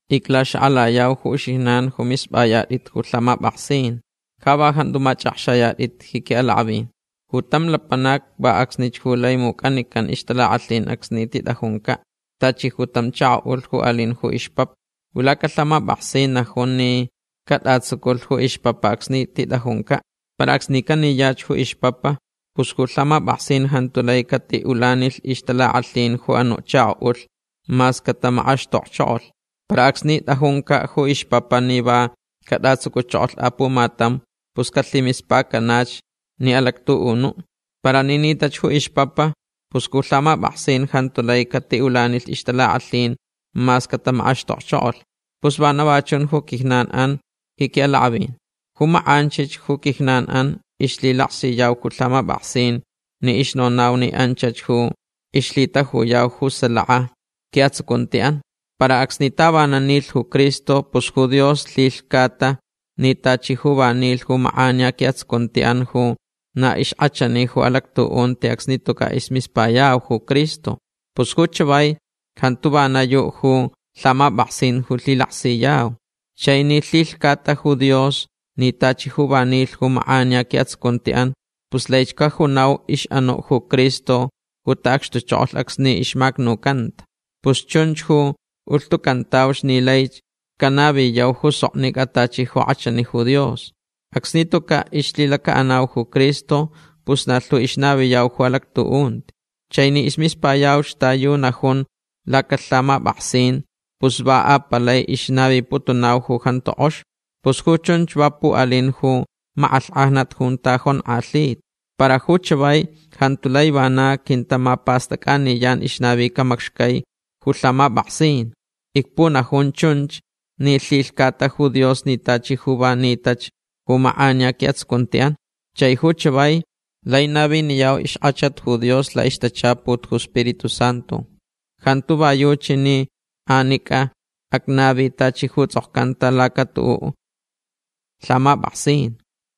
Iclaxakʼalayau ju uxijnan ju mispʼayatʼit ju lhamapʼaksin. Ja va jantu machʼakxayatʼit ji quiʼalakʼavin. Ju tam lapanac va acsnich ju lai mucʼanican ixtalakʼalhin acsni titʼajuncaʼ. Tachi ju tam chakoʼulh ju alin ju ixpapa. Ju lacalhamapʼaksin najun ni catʼatsuculh ju ixpapa acsni titʼajuncaʼ. Para acsni caniyach ju ixpapa pus ju lhamapʼaksin jantu lai catiʼulanilh ixtalakʼalhin ju anuʼ chakoʼulh mas catamakʼaxtokchokolh. Para acsni tʼajuncaʼ ju ixpapa ni va catʼatsuculh apumatam pus calhimispacanach ni alactuʼunuʼ. Para ni nitach ju ixpapa pus ju lhamapʼaksin jantu lai catiʼulanilh ixtalakʼalhin mas catamakʼaxtokchokolh. Pus vana va chun ju quijnanʼan ji quiʼalakʼavin. Ju makʼanchich ju quijnanʼan ixlhilaksiyau ju lhamapʼaksin ni ixnonau ni anchach ju caʼixlhitajuyau ju salaka quiʼatsucuntiʼan. Para acsni tavanan nilh ju Cristo pus ju Dios lhilhcata ni tachi ju va nilh ju makʼaniya quiʼatsucuntiʼan ju na ixkʼachani ju alactuʼunti acsni tucaʼ ismispayau ju Cristo. Pus ju chavai jantuch vana yuʼ ju lhamapʼaksin ju lhilaksiyau. Chai ni lhilhcata ju Dios ni tachi ju va nilh ju makʼaniya quiʼatsucuntiʼan pus laich cajunau ixʼanuʼ ju Cristo ju taʼacxtuchokolh acsni ixmacnucanta. Pus chunch ju ulhtucantauch ni laich canaviyau ju soknicʼa tachi ju kʼachani ju Dios. Acsni tucaʼ ixlhilacaʼanau ju Cristo pus na lhu ixnaviyau ju alactuʼunti. Chai ni ismispayauch ta yu najunch lacalhamapʼaksin pus va apalai ixnaviputunau ju jantu kʼox. Pus ju chunch va puʼalin ju makʼalhkʼajnat junta jonkʼalhita. Para ju chavai jantu lai vana quintamapastʼacʼaniyan ixnavica macxcai ju lhamapʼaksin. Icpunajun chunch ni lhilhcata ju Dios ni tachi ju va nitach ju makʼaniya quiʼatsucuntiʼan. Chai ju chavai lai naviniyau ixkʼachat ju Dios laʼixtachaput ju Spiritu Santu. Jantu va yuchi ni anicʼa acnavi tachi ju tsʼokcanta lakatuʼuʼ lhamapʼaksin.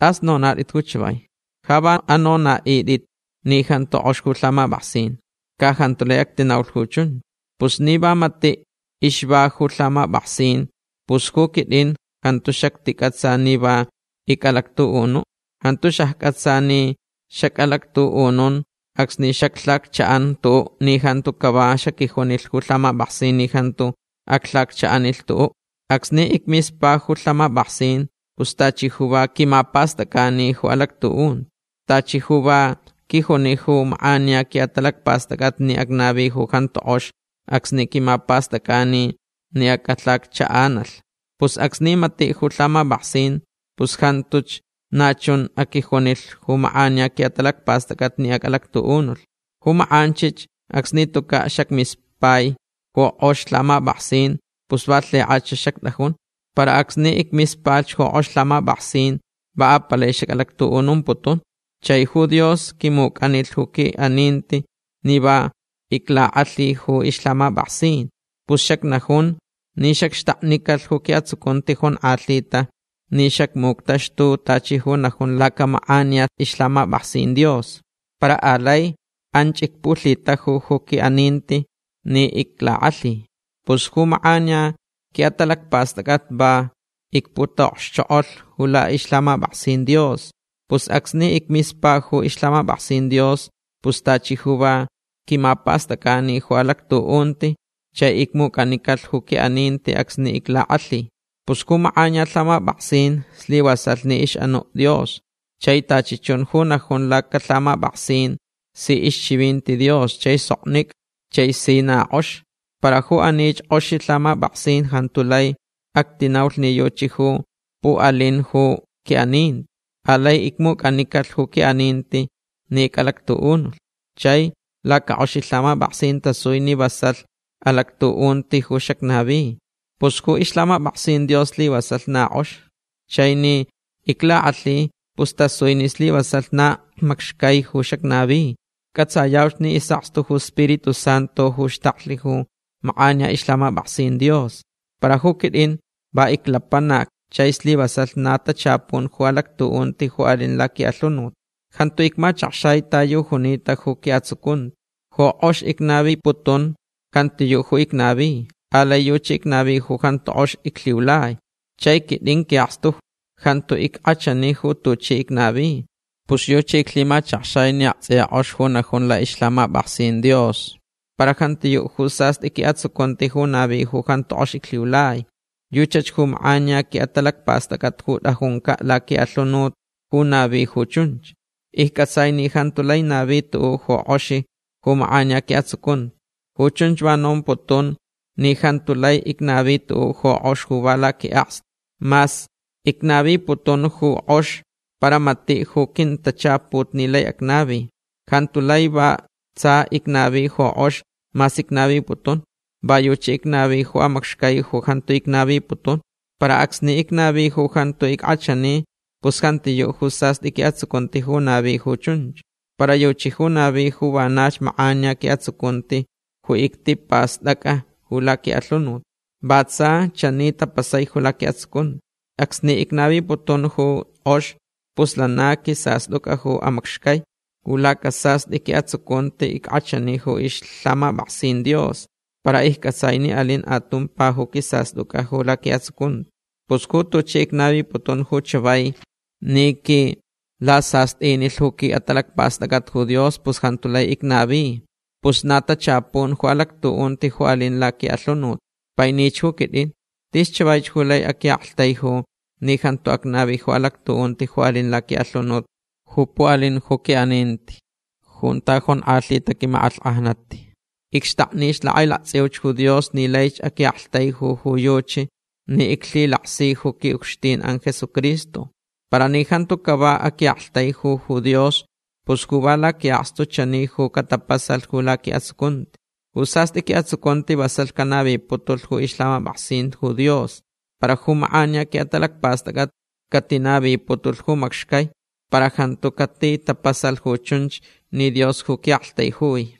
Tʼas anonaʼitʼit ju chavai. Ja va anonaʼitʼit ni jantu kʼox ju lhamapʼaksin. Ca jantu lai actinaulh ju chunch. Pus ni va matiʼ caʼixva ju lhamapʼaksin pus ju quitʼin jantu xacticʼatsa ni va icʼalactuʼunuʼ. Jantu xaccʼatsa ni xacʼalactuʼunun acsni xaclhacchaʼan tuʼuʼ ni jantu cava xaquijunilh ju lhamapʼaksin ni jantu aclhacchaʼanilh tuʼuʼ. Acsni icmispalh ju lhamapʼaksin pus tachi ju va quimapastʼacʼani ju alactuʼunti. Tachi ju va quijuni ju makʼaniya quiʼatalacpastʼacʼat ni acnavi ju jantu kʼox acsni quimapastʼacʼanilh ni acʼalhacchaʼanalh. Pus acsni matiʼ ju lhamapʼaksin pus jantuch na chun aquijunilh ju makʼaniya quiʼatalacpastʼacʼat ni acʼalactuʼunulh. Ju makʼanchich acsni tucaʼ xacmispata ju kʼox lhamapʼaksin pus va lhikʼach xactʼajun. Para acsni icmispalhch ju kʼox lhamapʼaksin va apalai xacʼalactuʼunumputun. Chai ju Dios quimucʼanilh ju quiʼaninti ni va iclakʼalhilh ju ixlhamapʼaksin. Pus xacnajun ni xacxtaknicalh ju quiʼatsucunti jonkʼalhita ni xacmuctaxtulh tachi ju najun lacamakʼaniya ixlhamapʼaksin Dios. Para alai anch icpulhitajulh ju quiʼaninti ni iclakʼalhi. Pus ju makʼaniya quiʼatalacpastʼacʼat va icputaʼokxchokʼolh ju laʼixlhamapʼaksin Dios. Pus acsni icmispalh ju ixlhamapʼaksin Dios pus tachi ju va quimapastʼacʼani ju alactuʼunti chai icmucʼanicalh ju quiʼaninti acsni iclakʼalhilh. Pus ju makʼaniya lhamapʼaksin slivasalh ni ixʼanuʼ Dios. Chai tachi chun ju najun lacalhamapʼaksin si ixchivinti Dios chai soknicʼa chai si na kʼox. Para ju anich kʼoxi lhamapʼaksin jantu lai actinaulh ni yuchi ju puʼalinch ju quiʼaninti. Alai icmucʼanicalh ju quiʼaninti ni icʼalactuʼunulh. Chai lacakʼoxi lhamapʼaksin tasui ni vasalh alactuʼunti ju xacnavi. Pus ju ixlhamapʼaksin Dios slivasalh na kʼox. Chai ni iclakʼalhilh pus tasui ni slivasalh na macxcai ju xacnavi. Cʼatsayauch ni isʼakstu ju Spiritu Santu ju xtaklh ju makʼaniya ixlhamapʼaksin Dios. Para ju quitʼin va iclapanac chai slivasalh na tachapun ju alactuʼunti ju alin laquiʼalhunut. Jantu icmachakxai ta yu junita ju quiʼatsucunti. Ju kʼox icnaviputun jantiyuʼ ju icnavi. Alai yuchi icnavi ju jantu kʼox iclhiulai. Chai quitʼin quiʼakstu jantu ickʼachani ju tuchi icnavi. Pus yuchi iclhimachakxai ni aktsʼiya kʼox ju najun laʼixlhamapʼaksin Dios. Para jantiyuʼ ju sastʼi quiʼatsucunti ju navi ju jantu kʼox iclhiulai. Yuchach ju makʼaniya quiʼatalacpastʼacʼat ju tʼajuncaʼ laquiʼalhunut ju navi ju chunch. Iccʼatsai ni jantu lai navi tuʼuʼ ju kʼox ju makʼaniya quiʼatsucunti. Ju chunch va nomputun ni jantu lai icnavi tuʼuʼ ju kʼox ju va laquiʼakstu. Mas icnaviputun ju kʼox para matiʼ ju quintachaput ni lai acnavi. Jantu lai va tsa icnavi ju kʼox mas icnaviputun. Va yuchi icnavi ju amacxcai ju jantu icnaviputun. Para acsni icnavi ju jantu ickʼachani pus jantiyuʼ ju sastʼi quiʼatsucunti ju navi ju chunch. Para yuchi ju navich ju vanach makʼaniya quiʼatsucunti ju ictipastʼacʼa ju laquiʼalhunut. Va tsa chani tapasai ju laquiʼatsucunti. Acsni icnaviputun ju kʼox pus lana quisastʼucʼa ju amacxcai. Ju lacasastʼi quiʼatsucunti ickʼachani ju ixlhamapʼaksin Dios. Para iccʼatsai ni alin atumpa ju quisastʼucʼa ju laquiʼatsucunti. Pus ju tuchi icnaviputun ju chavai ni quilasastʼinilh ju quiʼatalacpastʼacʼat ju Dios pus jantu lai icnavi. Pus na tachapun ju alactuʼunti ju alin laquiʼalhunut. Painich ju quitʼin. Tis chavaich ju lai aquiʼaktaiju ni jantu acnavi ju alactuʼunti ju alin laquiʼalhunut ju puʼalin ju quiʼaninti junta jonkʼalhita quimakʼalhkʼajnat. Icxtaknich lakʼailaktsʼiuch ju Dios ni laich aquiʼaktaijuyaʼ ju yuchi ni iclhilaksi ju quiʼucxtinʼan Jesucristo. Para ni jantu cava aquiʼaktaijulh ju Dios pus ju va laquiʼakstu chani ju catapasalh ju laquiʼatsucunti. Ju sastʼi quiʼatsucunti vasalh canaviputulh ju ixlhamapʼaksin ju Dios. Para ju makʼaniya quiʼatalacpastʼacʼat catinaviputulh ju macxcai. Para jantu catitapasalh ju chunch ni Dios ju quiʼaktaijui.